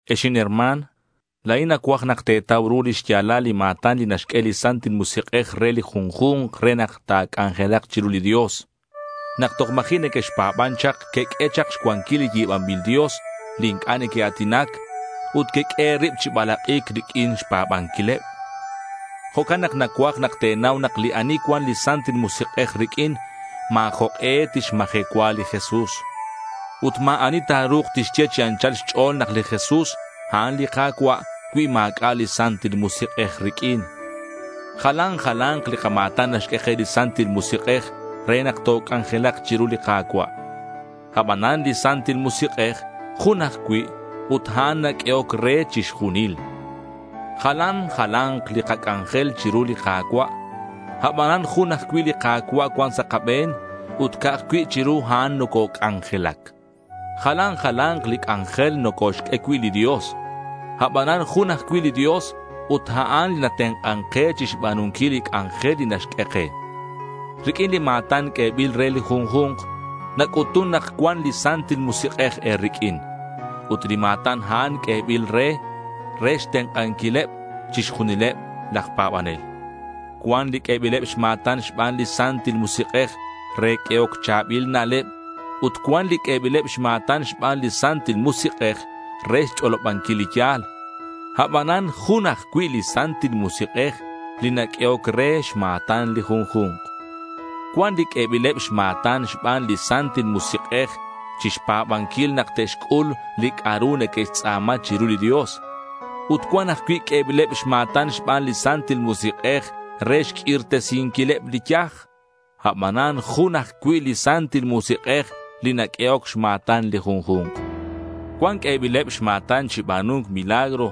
Ex inherma̱n, la̱in nacuaj nak te̱tau ru li xya̱lal li ma̱tan li naxq'ue li Santil Musik'ej re li junju̱nk re nak ta̱c'anjelak chiru li Dios. Nak toj ma̱ji' nequexpa̱ban chak queq'ue chak xcuanquil li yi̱banbil dios li inc'a' neque'a̱tinac ut queq'ue e̱rib chi balak'i̱c riq'uin xpa̱banquileb. Jo'can nak nacuaj te̱nau nak li ani cuan li Santil Musik'ej riq'uin, ma̱ jok'e tixmajecua li Jesús. Ut ma̱ ani ta̱ru̱k tixye chi anchal xch'o̱l nak li Jesús a'an li Ka̱cua' cui ma̱c'a' li Santil Musik'ej riq'uin. Jalan jala̱nk li kama̱tan naxq'ue ke li Santil Musik'ej re nak toc'anjelak chiru li Ka̱cua'. Abanan li Santil Musik'ej jun ajcui' ut a'an naq'uehoc re chixjunil. Jalan jala̱nk li kac'anjel chiru li Ka̱cua' abanan jun ajcui' li Ka̱cua' cuan sa' kabe̱n ut ca'aj cui' chiru a'an nococ'anjelac. Jalan jala̱nk li c'anjel nocoxq'ue cui' li Dios. Abanan jun ajcui' li Dios ut a'an li natenk'an ke chi xba̱nunquil li c'anjel li naxq'ue ke. Riq'uin li ma̱tan q'uebil re li junju̱nk nac'utun nak cuan li Santil Musik'ej riq'uin, ut li ma̱tan a'an q'uebil re, re xtenk'anquileb chixjunileb laj pa̱banel. Cuan li q'uebileb xma̱tan xban li Santil Musik'ej re q'uehoc cha̱bil na'leb ut cuan li q'uebileb xma̱tan xban li Santil Musik'ej re xch'olobanquil li ya̱l. Abanan jun ajcui' li Santil Musik'ej li naq'uehoc re xma̱tan li junju̱nk. Cuan li q'uebileb xma̱tan xban li Santil Musik'ej chi xpa̱banquil nak te'xc'ul li c'a'ru neque'xtz'a̱ma chiru li Dios. Ut cuan ajcui' q'uebileb xma̱tan xban li Santil Musik'ej re xq'uirtesinquileb li yaj. Abanan jun ajcui' li Santil Musik'ej li naq'uehoc xma̱tan li junju̱nk. Cuan q'uebileb xma̱tan chi ba̱nu̱nc milagro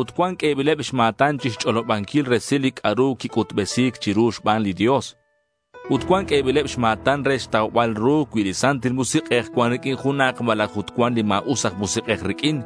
ut cuan q'uebileb xma̱tan chi xch'olobanquil resil li c'a'ru quic'utbesi̱c chiru xban li Dios. Ut cuan q'uebileb xma̱tan re xtaubal ru cui li Santil Musik'ej cuan riq'uin junak malaj ut cuan li ma̱us aj musik'ej riq'uin.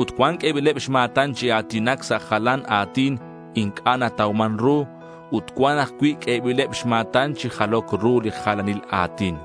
Ut cuan q'uebileb xma̱tan chi a̱tinac sa' jalan a̱tin inc'a' natauman ru ut cuan ajcui' q'uebileb xma̱tan chi jaloc ru li jalanil a̱tin.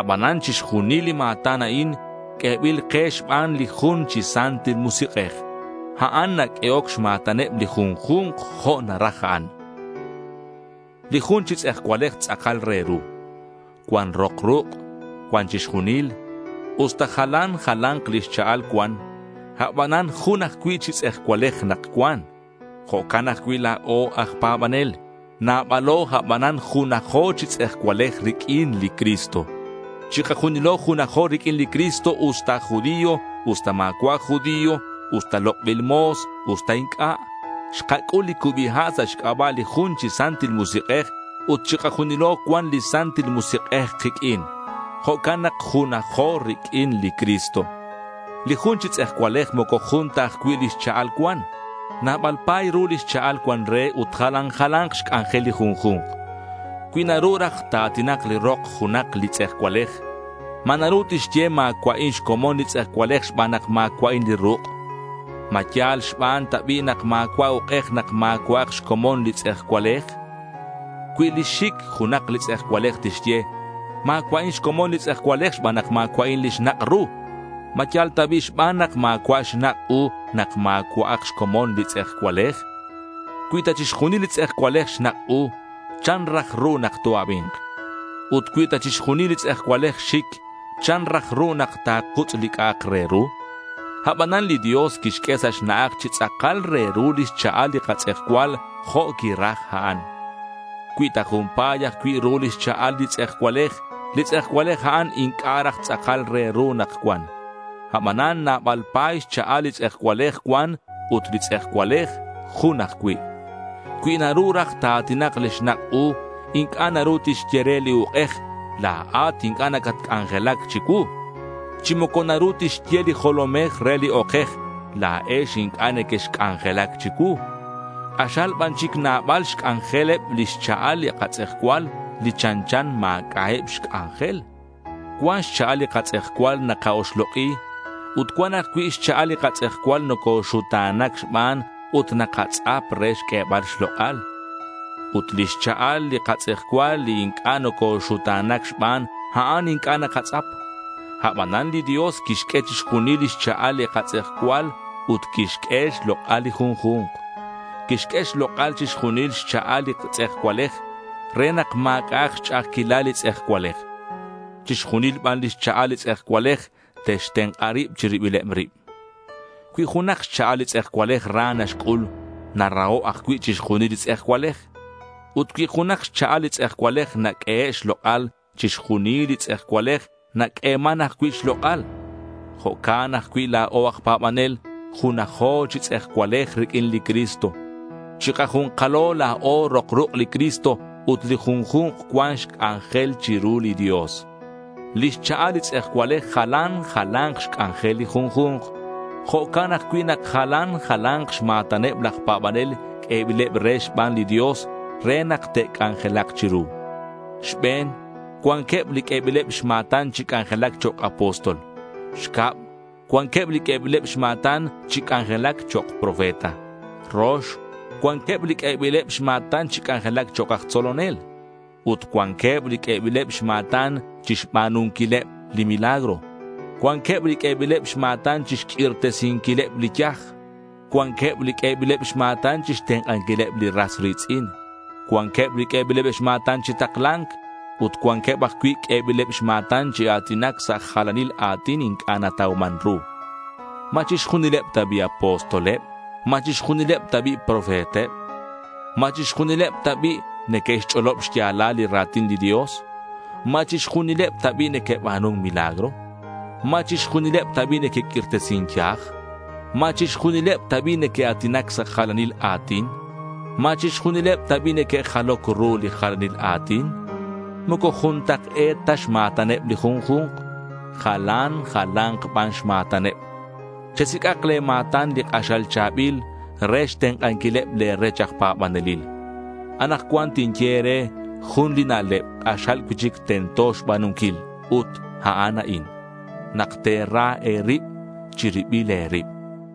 Abanan chixjunil li ma̱tan a'in q'uebil ke xban li jun chi Santil Musik'ej. A'an naq'uehoc xma̱taneb li junju̱nk jo' naraj a'an. Li jun chi tz'ejcualej tz'akal re ru. Cuan rok ruk'. Cuan chixjunil. Usta jalan jala̱nk lix cha'al cuan, abanan jun ajcui' chi tz'ejcualej nak cuan. Jo'can ajcui' la̱o aj pa̱banel. Nabalo, abanan junajo chi tz'ejcualej riq'uin li Cristo. Chikajunilo junajo riq'uin li Cristo usta aj judío, usta ma̱cua' aj judío, usta lok'bil mo̱s, usta inc'a'. Xkac'ul li cubi ha' sa' xc'aba' li jun chi Santil Musik'ej ut chikajunilo cuan li Santil Musik'ej kiq'uin. Jo'can nak junajo riq'uin li Cristo. Li jun chi tz'ejcualej moco jun ta ajcui' lix cha'al cuan. Nabal pa̱y ru lix cha'al cuan re ut jalan jala̱nk xc'anjel li junju̱nk. Cui naru raj ta̱a̱tinak li rok junak li tz'ejcualej, ¿ma naru tixye ma̱cua'in xcomon li tz'ejcualej xban nak ma̱cua'in li ruk'? ¿Ma yal xban ta bi' nak ma̱cua' uk'ej nak ma̱cua'ak xcomon li tz'ejcualej? Cui lix xic junak li tz'ejcualej tixye: ma̱cua'in xcomon li tz'ejcualej xban nak ma̱cua'in li xnak' ru, ¿ma yal ta bi' xban nak ma̱cua' xnak' u nak ma̱cua'ak xcomon li tz'ejcualej? Cui ta chixjunil li tz'ejcualej xnak' u, ¿chan raj ru nak to-abi̱nk? Ut cui ta chixjunil li tz'ejcualej xic, ¿chan raj ru nak takutz' li c'a'ak re ru? Abanan li Dios quixq'ue sa' xna'aj chi tz'akal re ru lix cha'al li katz'ejcual jo' quiraj a'an. Cui ta jun pa̱y ajcui' ru lix cha'al li tz'ejcualej, li tz'ejcualej a'an inc'a' raj tz'akal re ru nak cuan. Abanan nabal pa̱y xcha'al li tz'ejcualej cuan, ut li tz'ejcualej jun ajcui'. Cui naru raj ta̱a̱tinak li xnak' u inc'a' naru tixye re li uk'ej: la̱at inc'a' nacatc'anjelac chicuu. Chi moco naru tixye li jolomej re li okej: la̱ex inc'a' nequexc'anjelac chicuu. K'axal ban chic nabal xc'anjeleb lix cha'al li katz'ejcual li chanchan ma̱c'a'eb xc'anjel. Cuan xcha'al li katz'ejcual naka-oxlok'i ut cuan ajcui' xcha'al li katz'ejcual nocoxuta̱na̱c xban ut nakatz'ap re xq'uebal xlok'al. Ut lix cha'al li katz'ejcual li inc'a' nocoxuta̱na̱c xban, a'an inc'a' nakatz'ap. Abanan li Dios quixq'ue chixjunil lix cha'al li katz'ejcual ut quixq'ue xlok'al li junju̱nk. Quixq'ue xlok'al chixjunil xcha'al li tz'ejcualej re nak ma̱c'a'ak xch'a'ajquilal li tz'ejcualej. Chixjunil ban lix cha'al li tz'ejcualej te'xtenk'a rib chi ribileb rib. Cui junak xcha'al li tz'ejcualej ra naxc'ul, naraho' ajcui' chixjunil li tz'ejcualej. Ut cui junak xcha'al li tz'ejcualej naq'uehe' xlok'al, chixjunil li tz'ejcualej naq'ueman ajcui' xlok'al. Jo'can ajcui' la̱o aj pa̱banel. Junajo chi tz'ejcualej riq'uin li Cristo. Chikaju̱nkalo la̱o rok ruk' li Cristo ut li junju̱nk cuan xc'anjel chiru li Dios. Li xchalal li tz'ejcualej jalan jala̱nk xc'anjel li junju̱nk. Jo'can ajcui' nak jalan jala̱nk xma̱taneb laj pa̱banel q'uebileb re xban li Dios re nak te'c'anjelak chiru. Xbe̱n, cuanqueb li q'uebileb xma̱tan chi c'anjelac chok' apóstol. Xcab, cuanqueb li q'uebileb xma̱tan chi c'anjelac chok' profeta. Rox, cuanqueb li q'uebileb xma̱tan chi c'anjelac chok' aj tzolonel. Ut cuanqueb li q'uebileb xma̱tan chixba̱nunquileb li milagro. Cuanqueb li q'uebileb xma̱tan chixq'uirtesinquileb li yaj; cuanqueb li q'uebileb xma̱tan chixtenk'anquileb li ras ri̱tz'in. Cuanqueb li q'uebileb xma̱tan chi takla̱nc; ut cuanqueb ajcui' q'uebileb xma̱tan chi a̱tinac sa' jalanil a̱tin inc'a' natauman ru. ¿Ma chixjunileb ta bi' apostoleb? ¿Ma chixjunileb ta bi' profeteb? ¿Ma chixjunileb ta bi' neque'xch'olob xya̱lal li ra̱tin li Dios? ¿Ma chixjunileb ta bi' neque'ba̱nun milagro? ¿Ma chixjunileb ta bi' neque'q'uirtesin yaj? ¿Ma chixjunileb ta bi' neque'a̱tinac sa' jalanil a̱tin? ¿Ma chixjunileb ta bi' neque'jaloc ru li jalanil a̱tin? Moco juntak'e̱t ta xma̱taneb li junju̱nk. Jalan jala̱nk ban xma̱taneb. Chesic'ak le̱ ma̱tan li k'axal cha̱bil re xtenk'anquileb le̱ rech aj pa̱banelil. Anakcuan tinye e̱re jun li na'leb k'axal cui'chic tento xba̱nunquil. Ut a'an a'in: nak te̱ra e̱rib chi ribil e̱rib.